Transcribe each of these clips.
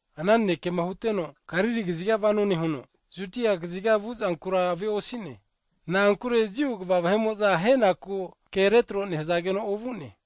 Ana nanekema huteno Galili kaziga vano nehuno, Judia kaziga vu'zankura ave'osi'ne, na'ankure Jiu kva vahe'mo'za ahenaku ke retro nehzageno ovu'ne.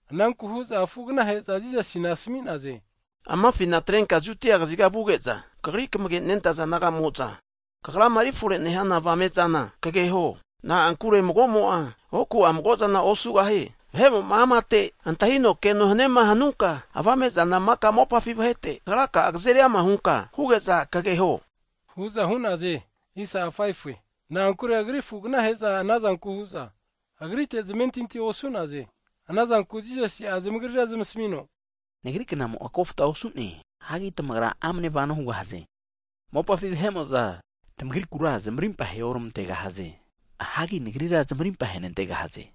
Ananku hu'za afu'agnahe'za Jisasi asmi'naze, Amafina atrenka Judia kaziga vuge'za, Kagri kamagenentaza disaipol naga'mo'za, Kagrama eri fore nehana avame'zana kageho. Na'ankure mago'mo'a oku'a mago'zana osugahie. Vahe'mo'ma amate antahino keno haniema hanunka, avamezama maka mopafi vahete Kagraka'a kzeri ama hunka huge'za kageho, hu'za hu'naze. Na'ankure Agri afu'agnahe'za anazanke hu'za, Agritera zamentinti osu'naze. Anazanku Jisasi'a zamagrira zamasmino, Nagri knamo'a kofta osu'ne, hagi tamagra amne vano hugahaze. Mopafi vahe'mo'za tmagrikura zamarimpa aheormantegahaze. Hagi Nagrira zamarimpa ahenantegahaze,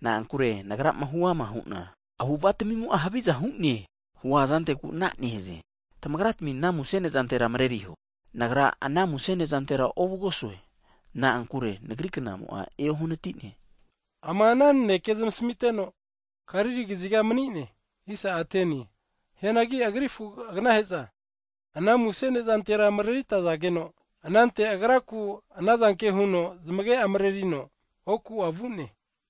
na'ankure Nagrama huama hu'na avu'ava tmimo'a haviza hu'ne, huazanteku ana nehaze. Tamagra'tmi ana muse nezantera mreriho, Nagra ana muse nezantera ovugosue, na'ankure Nagri knamo'a eohnati'ne. Ama ana nanekema zamasmiteno, Galili kaziga mani'ne. Hianagi Agri afu'agnahe'za ana muse ne'zantera mareritazageno, anante Agraku anazanke huno zamage'a mrerino, oku'a vu'ne.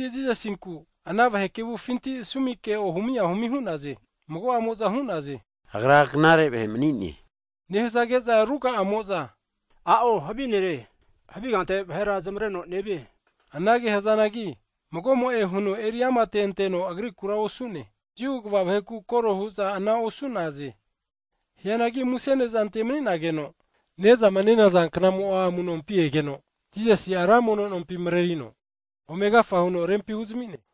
Jisasinku ana vahe kevufinti sumi ke ohumi ahumi hu'za Agra knare Ne' mani'ne, nehzage'za ruga'amo'za huza a'o havi ne'kino, vahera zamavreno havi kante nevie hu'naze. Anage hzanagi mago'mo'e huno eri amateno Agrikura osu'ne, Jiu kva vaheku kore hu'za ana osu'naze. Hianagi muse ne'zante mani'nageno knamo'a amu'nompi egeno Jisasi'a ra mono nompi mrerino, ome agafa huno rempi huzami'ne.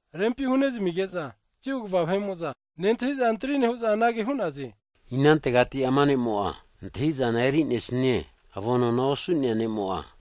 Rempi hunezmige'za Jiu kva vahe'mo'za nentahi'za antri nehu'za, anage hu'naze. Inantegati ama ne'mo'a antahi'zana eri'nesnie, avonona osu'nea ne'mo'a?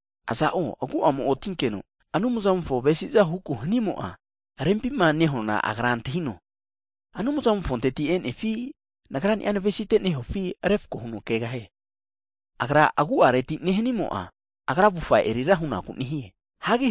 Aza'o agu'amo otinkeno Anumzamofo avesi'za huku hanimo'a, rempima nehuana agra antahino, Anumzamofonteti e'nefi, Nagrani'a navesite nehufi refko huno kegahie. Agra'a agu'areti nehanimo'a, agra avufa erira hunaku nehie. Hagi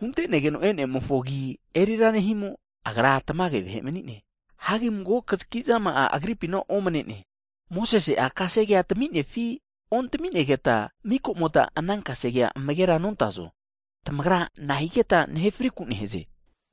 huntenegeno e'nemofo agi erira nehimo, Agra tamage vahe mani'ne. Hagi mago kzaki zama'a Agripina omne'ne. Mosese'a kasegea taminefi, ontami'negeta, mika'mota ana kasegea amagera nontazo? Tamagra nahigeta nahe frinakura nehaze?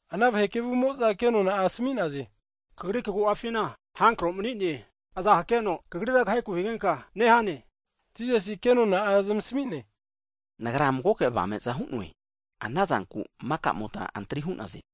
Ana vahe kevumo'za ke nona'a asmi'naze, Kagri kagu'afina havi avamu mani'ne! Iza Kagrira kaheku higenka nehane? Jisasi ke nona'a zamasmi'ne, Nagra magoke avame'za hu'noe, anazanku maka'mota antri hu'naze.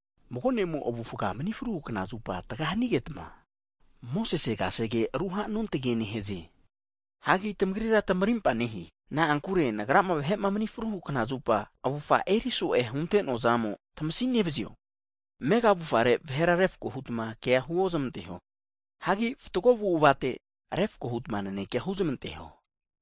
Mago ne'mo avufa mni fruhu kna zupa tga hanigetma, Mosese kasege ruhanontagie nehaze. Hagi tamagrira tmarimpa nehe, na'ankure Nagrama vahe'ma mni fruhu knazupa avufa eri so'e hunte'noa zamo tmasia nevzio? Amega zamufarera vahera refko hutma keaga (kotim) huozmanteho. Hagi fatgo avu'avate refko huta nanekea huzmanteho.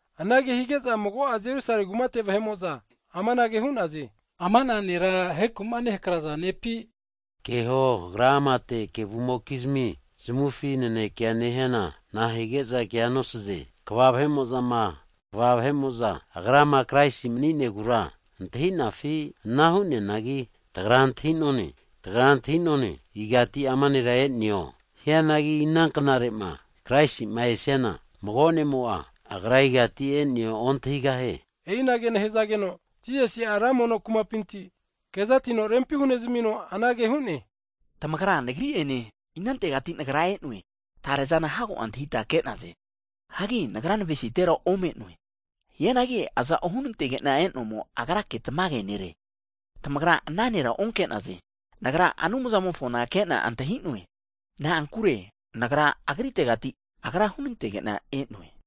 Anage hige'za mago'a Jerusale kumate vahe'mo'za amanage hu'naze, Ama'na Nera aheku'ma nehakraza nepi? Keho, Agra amate kevumokizmi zamufi naneke nehiana nahige'za kea nosaze? Kva vahe'mo'za Agrama Kraisi mani'negura, antahi'nafi? Ana hu'neanagi, tagra antahi'none igati ama nera e'neo, hianagi ina knarema Kraisi'ma esiana, mago ne'mo'a Agra igati e'neo ontahigahie. E'i anage nehzageno Jisasi'a ra mono kumapinti (tempol) kezatino rempi hunezmino anage hu'ne, Tamagra, Nagri ene, inantegati Nagra e'noe tarezana hago antahita, ke'naze. Hagi Nagra navesitera ome'noe, hianagi aza'o hunantege'na e'nomo, Agrake tamage nere, tamagra ana nera onke'naze. Nagra, Anumzamofona ke'na antahi'noe, na'ankure Nagra, Agritegati Agra hunantege'na e'noe.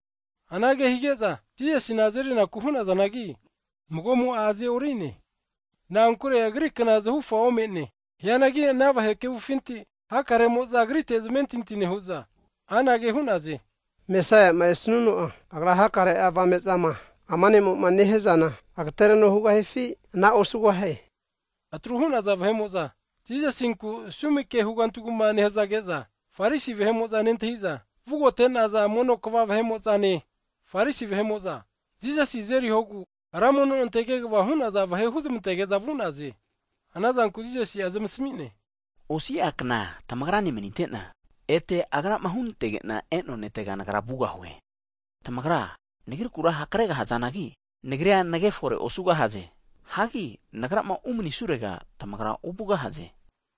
Anage hige'za Jisasi'na azerinaku hu'nazanagi, mago'mo'a aze'orine, na'ankure Agri kna zahufa ome'ne. Hianagi ana vahe kevufinti hakaremo'za, Agrite zamentinti nehu'za anage hu'naze, Mesaia'ma esuno'a, Agra hakare'a avame'zama ama ne'moma nehia zana agtereno hugahifi ana osugahie? Atru hu'naza vahe'mo'za Jisasinku sumi ke hugantu hugma nehzage'za, Farisi vahe'mo'za nentahi'za, vugote'naza mono kva (Pris) vahe'mo'zane Farisi vahe'mo'za, Jisasi azerihogu ra mono nonte kegva hu'naza vahe (tempol gats) huzmantage'za vu'naze. Anazanku Jisasi zamasmi'ne, osi'a kna tamagra ne manite'na, ete Agrama hunantege'na e'noa Netega Nagra vugahue. Tamagra, Nagrikura hakre gahazanagi, Nagria nagefore osugahaze. Hagi Nagrama umani'surega tamagra ovugahaze.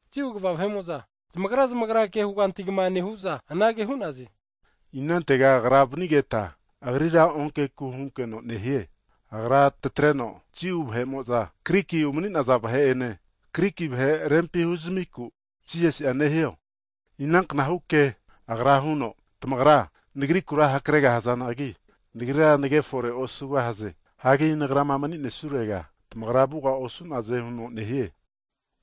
Jiu kva vahe'mo'za zamagra zamagra ke hugantu hugma nehu'za anage hu'naze, Inantega Agra vnigeta Agrira onkeku hunkeno nehie? Agra tatreno Jiu vahe'mo'za Griki umani'naza vahe ene, Griki vahe rempi huzamiku Jisasi'a nehio? Ina knahu ke Agra huno, Tamagra, Nagrikura hakre'gahazanagi, Nagria nage fore osugahaze, hagi Nagrama mani'nesurega tamagra vuga osu'naze huno nehie?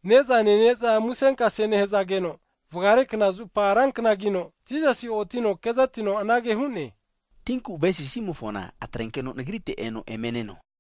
Ne'za nene'za musenkase nehzageno, vgare kna zupa ran knagino, Jisasi otino kezatino anage hu'ne, Tinku avesinimofona, atrenkeno Nagrite eno eme neno.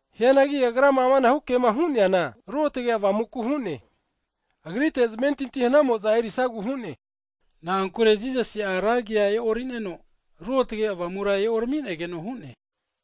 Hianagi Agrama amanahu kema hu'neana Ruotge Avamuku hu'ne, Agrite zamentinti hanamo'za erisagu hu'ne, na'ankure Jisasi'a ra agi e'orineno, Ruotge Avamura eoraminegeno hu'ne.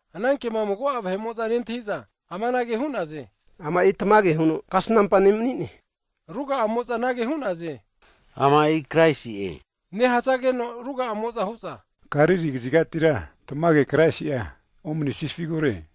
Ana kema mago'a vahemo'za nentahi'za, amanage hu'naze, Ama'i tamage huno Kasnampa ne' mani'ne hu'za hu'naze. Ruga'amo'za anage hu'naze, Ama'i Kraisi'e nehzageno, ruga'amo'za hu'za, Galili kzigatira tamage Kraisi'a omesnifigure?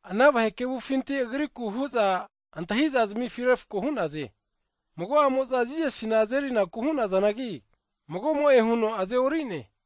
Ana vahe kevufinti Agriku hu'za antahi'za zamifi refko hu'naze, Mago'amo'za Jisasina azerinaku hu'nazanagi, mago'mo'e huno aze'orine.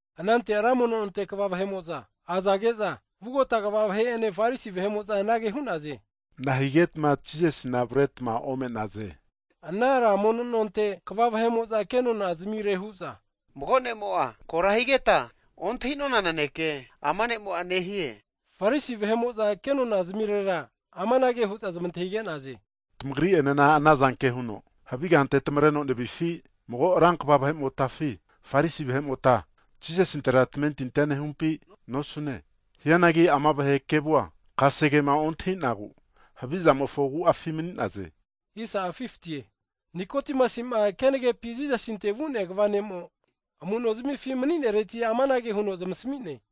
Anante ra mono nonte kva vahe'mo'za azage'za, vugota pris kva vahe'ene Farisi vahe'mo'za anage hu'naze, nahigetma Jisasina avretma ome'naze? Ana ra mono nonte kva vahe'mo'za kenona'a hu'za, Mago ne'mo'a kora higeta ontahi'nona naneke, ama ne'mo'a nehie. Farisi vahe'mo'za kenona'zmirera amanage hu'za zamantahige'naze. Tamagri'enena anazanke huno havi kante tmareno nevifi? Mago ran kva vahe'motafi, Farisi vahe'mota, Jisasintera tamentintia nehumpi nosu'ne? Hianagi ama vahe kevua, kasegema ontahi'nagu havizamofo agu'afi mani'naze. Nikodimasi'ma kenagepi Jisasinte vu'nea kva ne'mo, amu'no zamifi mani'nereti amanage huno zamasmi'ne.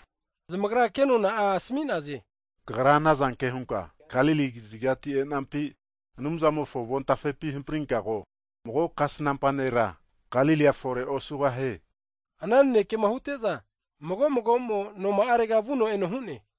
Zamagra kenona'a asmi'naze, Kagra anazanke hunka Galili kazigati e'nampi? Anumzamofo avon tafepi hamprinka ko, mago kasnampa (profet) nera Galilia fore osugahie, hu'za Nikodimasi asmi'naze. [Ana nanekema hute'za, mago mago'mo noma'arega vuno eno hu'ne.